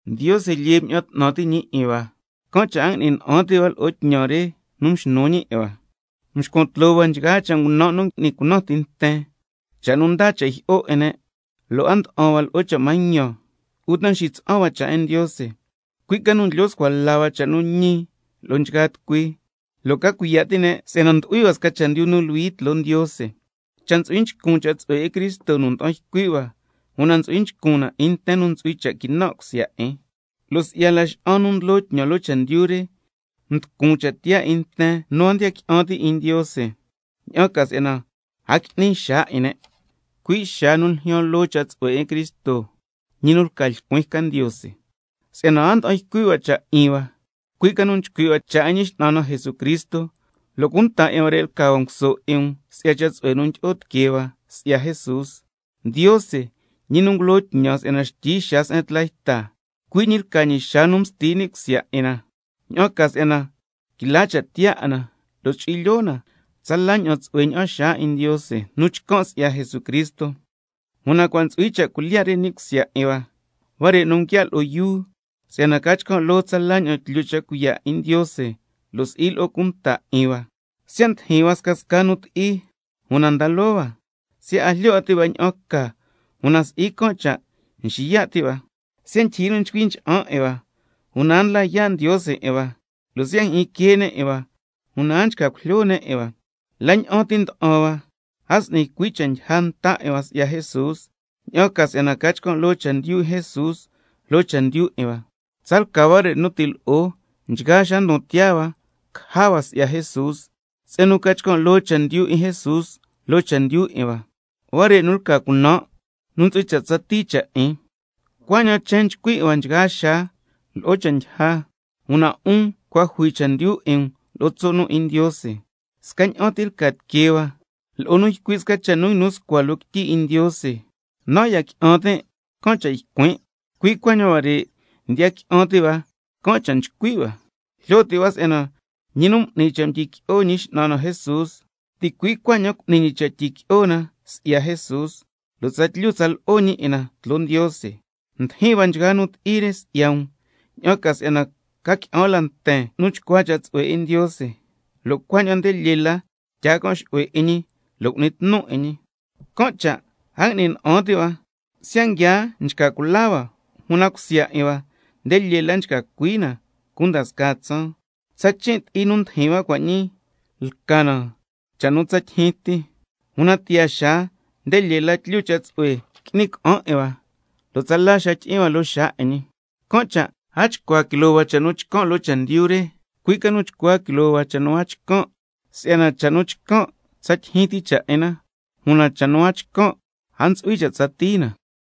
Ndiose lyee mña'an 'tnan ti' ñi 'in hua, can' cha' a ngui'ni na'an ti' hua lo'o tñan re nu mxnu ñi 'in hua. Nxcuan tloo hua nchgaa cha' ngunan' nu ngui'ni cunan ti nten, cha' nu ndaa cha' jyi'o 'in ne', lo' a nda'an hua lo'o cha' mañan, uta nxitsa'an hua cha' 'in Ndiose. Cui' ca nu ndlyo scua la hua cha' nu ñi lo'o nchgaa tucui, lo' ca cuiya' ti' ne' si'yana ndu'hui hua sca chendyu nu luhui tloo Ndiose. Cha' ntsu'hui nchcun cha' tsu'hue 'in Cristo nu nda'an ycui' hua, una ntsu'hui nchcun na 'in nten nu ntsu'hui cha' quinan' cusya 'in. Lo' si'ya laxa'an nu ndlo tñan loo chendyu re, mducun cha' tiyaa 'in nten nu a ndiya qui'an ti' 'in Ndiose, ña'an ca si'yana a qui'ni xaa 'in ne', cui' xaa nu ljyaan loo cha' tsu'hue 'in Cristo, ñi nu lca lcuin ca Ndiose. Si'yana a nda'an ycui' hua cha' nu 'in hua, cui' ca nu nchcui' hua cha' 'in Ñi X'nan na Jesucristo, lo' cunta 'in huare' lca hua nguso 'in um si'ya cha' tsu'hue nu ndyi'o tiquee hua si'ya Jesús. Ndiose, ñi nu ngulo tñan si'yana xtyi xaa se'en tla yta, cui' ñi lca ñi xaa nu msti ni' cusya 'in na, ña'an ca si'yana quila cha' tiyaa 'in na, lo' chu'hui lyoo na tsala ña'an tsu'hue ña'an xaa 'in Ndiose nu chcan' si'ya Jesucristo. Una cua' ntsu'hui cha' cuilyiya' re ni' cusya 'in hua, huare' nu nguiaa' lo'o yuu, si'yana ca chcan' loo tsala ña'an tlyu cha' cuiya' 'in Ndiose, lo' si'i lo'o cunta 'in hua. Siya' ndijin hua scasca nu ti'i, una nda loo hua, siya' a jlyo 'a ti' hua ña'an ca, una si'i can' cha' nxiya' ti' hua, siya' ndyijyi nu nducui ncha'an 'in hua, una a ndla yaa' Ndiose 'in hua, lo' siya' njyi'in quee ne' 'in hua, una a nchca cujlyo ne' 'in hua, la ña'an ti nda'an hua, a s'ni cui' cha' ndyija nta hua si'ya Jesús, ña'an ca si'yana ca chcan' loo chendyu 'in Jesús loo chendyu 'in hua. Si'yana tsalca huare' nu ti' lo'o, nchgaa xaa ndon tiyaa hua caja hua si'ya Jesús, se'en nu ca chcan' loo chendyu 'in Jesús loo chendyu 'in hua, huare' nu lca cunan' nu ntsu'hui cha' tsatii cha' 'in. Cuaña'an chen nchcui 'in hua nchgaa xaa lo'o cha' ndyija, una 'un cua' jui chendyu 'in um lo'o tso' nu 'in Ndiose. Scaña'an ti lca tiquee hua lo'o nu ycui' sca cha' nu nguinu scua loo quityi 'in Ndiose: —Nan' ya qui'an tin', can' cha' ycuin'—, cui' cuaña'an huare', ndiya qui'an ti' hua, can' cha' nchcui' hua. Jlyo ti' hua si'yana ñi nu m'ni cha' mdyiqui'o Ñi X'nan na Jesús, ticui' cuaña'an cu'ni ñi cha' tyiqui'o na si'ya Jesús, lo' tsatlyu tsa lo'o ñi 'in na tloo Ndiose. Ndijin hua nchgaa nu ti'i re si'ya um, ña'an ca si'yana ca qui'an la nten nu chcua cha' tsu'hue 'in Ndiose, lo' cuaña'an nde lyee la tyaa can' xu'hue 'in ñi lo' cu'ni tnu 'in ñi. Can' cha' a ngui'ni na'an ti' hua, siya' nguia nchca cula hua, una cusya 'in hua nde lyee la nguia nchca cui na cunda scaa tsaan. Tsa chin' ti'i nu ndijin hua cua' ñii lca na cha' nu tsa tyijyin ti, una tiyaa xaa nde lyee la tlyu cha' tsu'hue qui'ni ca'an 'in hua, lo' tsala xaa tyi'in hua loo xaa 'in ñi, can' cha' a chcua quiloo hua cha' nu chcan' loo chendyu re, cui' ca nu chcua quiloo hua cha' nu a chcan', si'yana cha' nu chcan' tsa ndyijyin ti cha' 'in na, una cha' nu a chcan' a ntsu'hui cha' tsatii na.